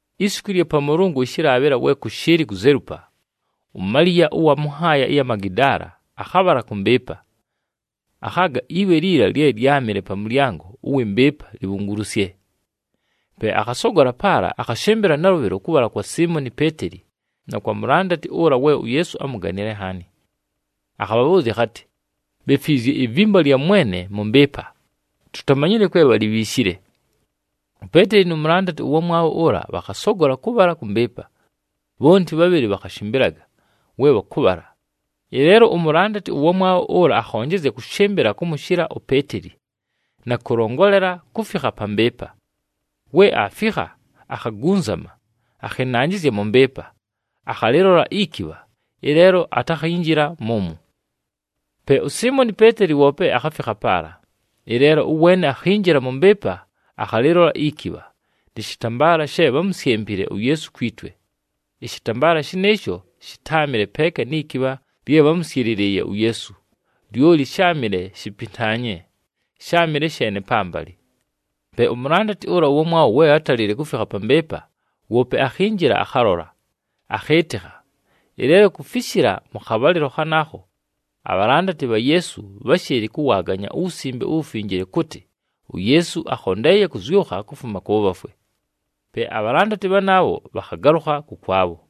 Isiku ɨlya Pamʉlʉngʉ ɨshɨlaabhɨla we kʉshɨɨlɨ kuzelupa, uMaliya ʉwa mʉ nhaaya ɨya mu Magidaala akhabhala kʉ mbɨɨpa. Akhaaga iwe liila lye lyámɨle pa mʉlyango ʉwɨ mbɨɨpa libhungulusye. Pe akhasogola paala, akhashɨmbɨla nalʉbhɨlo kʉbhala kwa Siimoni Peeteli na kwa mulandati ʉla we uYeesu ámuganile nhaani. Akhabhabhʉʉzya akhatɨ, “Bhefwizye ivimba lya Mwene mʉ mbɨɨpa, tutamanyile kwe bhalibhiishile!” UPeeteli nu mulandati ʉwamwabho ʉla, bhakhasogola kʉbhala kʉ mbɨɨpa. Bhonti bhabhɨlɨ bhakhashɨmbɨlaga we bhakʉbhala, ɨleelo umulandati ʉwamwabho ʉla akhonjezya kʉshɨmbɨla kʉmʉshɨla uPeeteli na kʉlongolela kufikha pa mbɨɨpa. We aafikha, akhagunzama, akhɨnanjɨzya mʉ mbɨɨpa, akhalɨlola ikibha, ɨleelo atakhinjila mʉmwo. Pe uSiimoni Peeteli woope akhafikha paala, ɨleelo ʉweene akhinjila mʉ mbɨɨpa akhalɨlola ikibha, nɨ shɨtambaala she bhámusyempile uYeesu kwi twe. Ɨshɨtambaala shɨnɨɨsho shɨtáamɨle peeka ni kibha lye bhámʉsyɨlɨlɨɨye uYeesu, lyoli sháamɨle shipintaanye, sháamɨle sheene pambalɨ. Pe umulandati ʉla ʉwamwabho we átalile kufikha pa mbɨɨpa, woope akhinjila akhalola, akhɨɨtɨkha. Ɨleelo kufishila mʉ khabhalɨlo khanaakho, abhalandati bha Yeesu bháshɨɨlɨ kʉwaaganya uWusimbe uWufinjile kʉtɨ uYeesu akhondeeye kʉzyʉkha kufuma kʉ bhafwe. Pe abhalandati bhanaabho bhakhagalʉkha kʉkwabho.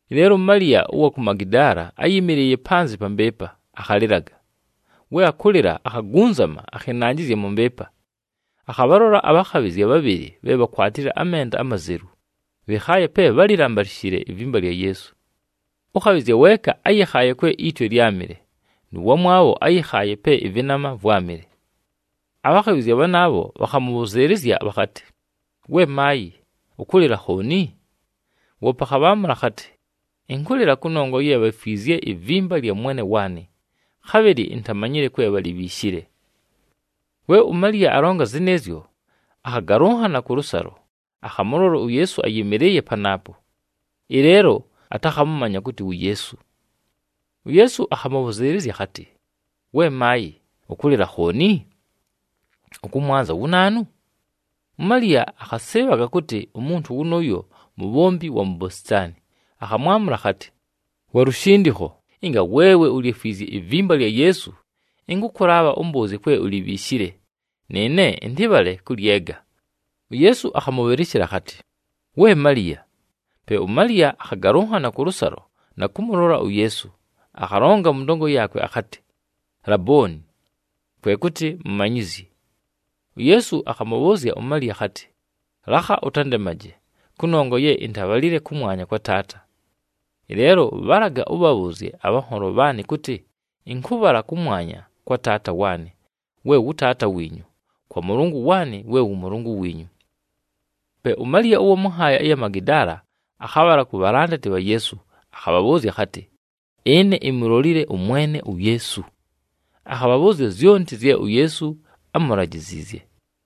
Ɨleelo uMaliya ʉwa ku Magidaala áyɨmɨlɨɨye panzɨ pa mbɨɨpa, akhalɨlaga. We akʉlɨla, akhagunzama akhɨnanjɨzya mʉ mbɨɨpa. Akhabhalola abhakhabhɨzya bhabhɨlɨ bhe bhakwatile amenda amazelu, bhɨkhaaye pe bhálambalishile ivimba lya Yeesu. Ʉkhabhɨzya weeka áyɨkhaaye kwe itwe lyámɨle, nʉ wamwabho áyɨkhaaye pe ɨvɨnama vwámɨle. Abhakhabhɨzya bhanaabho bhakhamʉbhʉzɨɨlɨzya bhakhatɨ, “We maayɨ, ʉkʉlɨla khooni?” Woope akhabhaamʉla akhatɨ, “Ɨnkʉlɨla kʉnongwa ye bhefwizye ivimba lya Mwene waanɨ, khabhɨlɨ intamanyile kwe bhalibhiishile!” We uMaliya alonga zɨnɨɨzyo, akhagalʉnhana kʉlʉsalo, akhamʉlola uYeesu ayɨmɨlɨɨye panaapo. Ɨleelo atakhamʉmanya kʉtɨ wu Yeesu. UYeesu akhamʉbhʉzɨɨlɨzya akhatɨ, “We maayɨ, ʉkʉlɨla khooni? Ʉkʉmwanza wu naanu?” UMaliya akhasɨɨbhaga kʉtɨ umuntu wʉnʉʉyo mubhombi wa mu bositaani, akhamwamʉla akhatɨ, “Wa lushindikho, ɨnga weewe ulyefwizye ivimba lya Yeesu, ɨnkʉkʉlaabha ʉmbʉʉzye kwe ulibhiishile, nɨɨne ɨntɨbhale kʉlyega.” UYeesu akhamʉbhɨlɨshɨla akhatɨ, “We Maliya!” Pe uMaliya akhagalʉnhana kʉlʉsalo na kʉmʉlola uYeesu, akhalonga mʉ ndongo yaakwe akhatɨ, “Labooni!” Kwe kʉtɨ, “Mumanyizyi.” UYeesu akhamʉbhʉʉzya uMaliya akhatɨ, “Lakha ʉtandemaje, kʉnongwa ye intabhalile kʉmwanya kwa Taata. Ɨleelo bhalaga ʉbhabhʉʉzye abhanholo bhaanɨ kʉtɨ ɨnkʉbhala kʉmwanya kwa Taata waanɨ we wʉ Taata wiinyu, kwa Mʉlʉngʉ waanɨ we wʉ Mʉlʉngʉ wiinyu.” Pe uMaliya ʉwa mʉ nhaaya ɨya mu Magidaala akhabhala ku bhalandati bha Yeesu. Akhabhabhʉʉzya akhatɨ, “Ɨne imulolile ʉMwene uYeesu!” Akhabhabhʉʉzya zyonti zye uYeesu ámulajiziizye.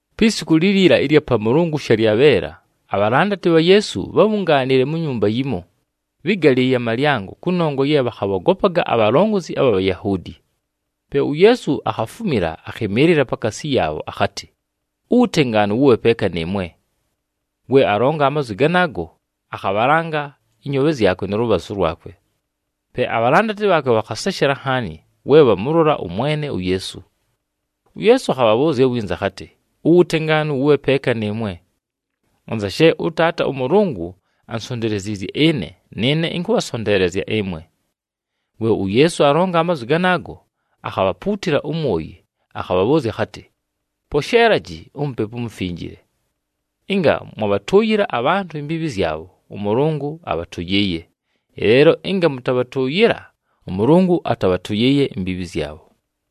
Pi siku liliila ɨlya Pamʉlʉngʉ shalyabheela, abhalandati bha Yeesu bhábhungaanile mu nyumba yimo, bhɨ́galɨɨye amalyango kʉnongwa ye bhakhabhogopaga abhalongozi abha Bhayahuudi. Pe uYeesu akhafumila akhɨmɨɨlɨla pakaasi yaabho akhatɨ, “Uwutengaanu wʉbhe peeka nɨɨmwe!” We alonga amazwi ganaago, akhabhalanga ɨnyoobhe zyakwe nʉ lʉbhazʉ lwakwe. Pe abhalandati bhaakwe bhakhaseshela nhaani we bhamʉlola ʉMwene uYeesu. UYeesu akhabhabhʉʉzya winza akhatɨ, “Uwutengaanu wʉbhe peeka nɨɨmwe. Anza she ʉTaata ʉMʉlʉngʉ ansonteleziizye ɨne, nɨɨne ɨnkʉbhasonteelezya ɨmwe.” We uYeesu alonga amazwi ganaago, akhabhapuutila umwoyi, akhabhabhʉʉzya akhatɨ, “Posheelaji uMupepu uMufinjile. Ɨnga mwabhatʉʉyɨla abhantʉ imbiibhi zyabho, ʉMʉlʉngʉ abhatʉyɨɨye. Ɨleelo ɨnga mʉtabhatʉʉyɨla, ʉMʉlʉngʉ atabhatʉyɨɨye imbiibhi zyabho.”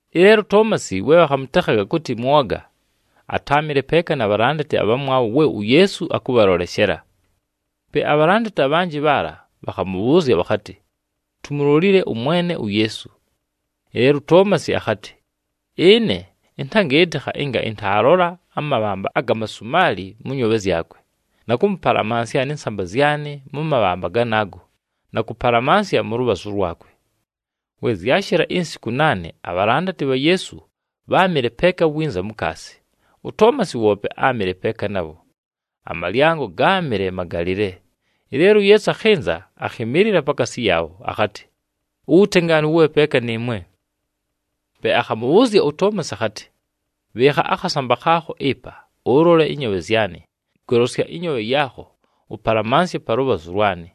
Ɨleelo uToomasi, we bhakhamʉtekhaga kʉtɨ Mwoga, atáamɨle peeka na bhalandati abhamwabho we uYeesu akʉbhaloleshela. Pe abhalandati abhanjɨ bhaala bhakhamʉbhʉʉzya bhakhatɨ, “Tumulolile ʉMwene uYeesu.” Ɨleelo uToomasi akhatɨ, “Ɨne ɨntagɨɨtɨkha ɨnga ɨntaalola amabhamba aga masumaali mʉ nyoobhe zyakwe, na kʉmʉpalamansya nɨ nsamba zyanɨ mʉ mabhamba ganaago na kʉpalamansya mʉ lʉbhazʉ lwakwe.” We zyashɨla insiku naane, abhalandati bha Yeesu bháamɨle peeka winza mukaasi. UToomasi woope áamɨle peeka nabho. Amalyango gáamɨle magalɨle, ɨleelo uYeesu akhɨnza, akhɨmɨɨlɨla pakaasi yaabho, akhatɨ, “Uwutengaanu wʉbhe peeka nɨɨmwe!” Pe akhamʉbhʉʉzya uToomasi akhatɨ, “Bhɨɨkha akhasamba khaakho ɨpa, ʉlole ɨnyoobhe zyanɨ, golosya ɨnyoobhe yaakho ʉpalamansye pa lʉbhazʉ lwanɨ.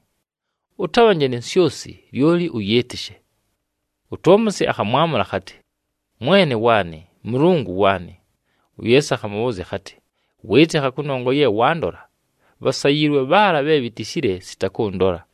Ʉtabhanje ni nsyosi, lyoli ʉyɨɨtɨshe.” UToomasi akhamwamʉla akhatɨ, “Mwene waanɨ, Mʉlʉngʉ waanɨ!” UYeesu akhamʉbhʉʉzya akhatɨ, “Wɨɨtɨkha kʉnongwa ye wandola. Bhasayiilwe bhaala bhe bhitishile sita kʉndola.”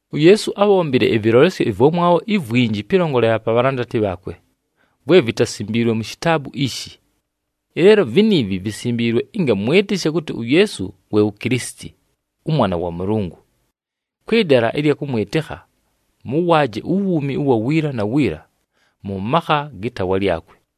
UYeesu ábhombile ɨvɨlolesyo ɨvwamwabho ivwinji pɨlongolela pa bhalandati bhaakwe, vwe vitasimbiilwe mu shitaabu ishi. Ɨleelo viniivi visimbiilwe ɨnga mwɨtɨshe kʉtɨ uYeesu we wu Kilisiti, ʉMwana wa Mʉlʉngʉ. Kwɨ dala ɨlya kʉmwɨtɨkha, mʉwaaje uwuumi ʉwa wiila na wiila, mʉ makha gɨ taawa lyakwe.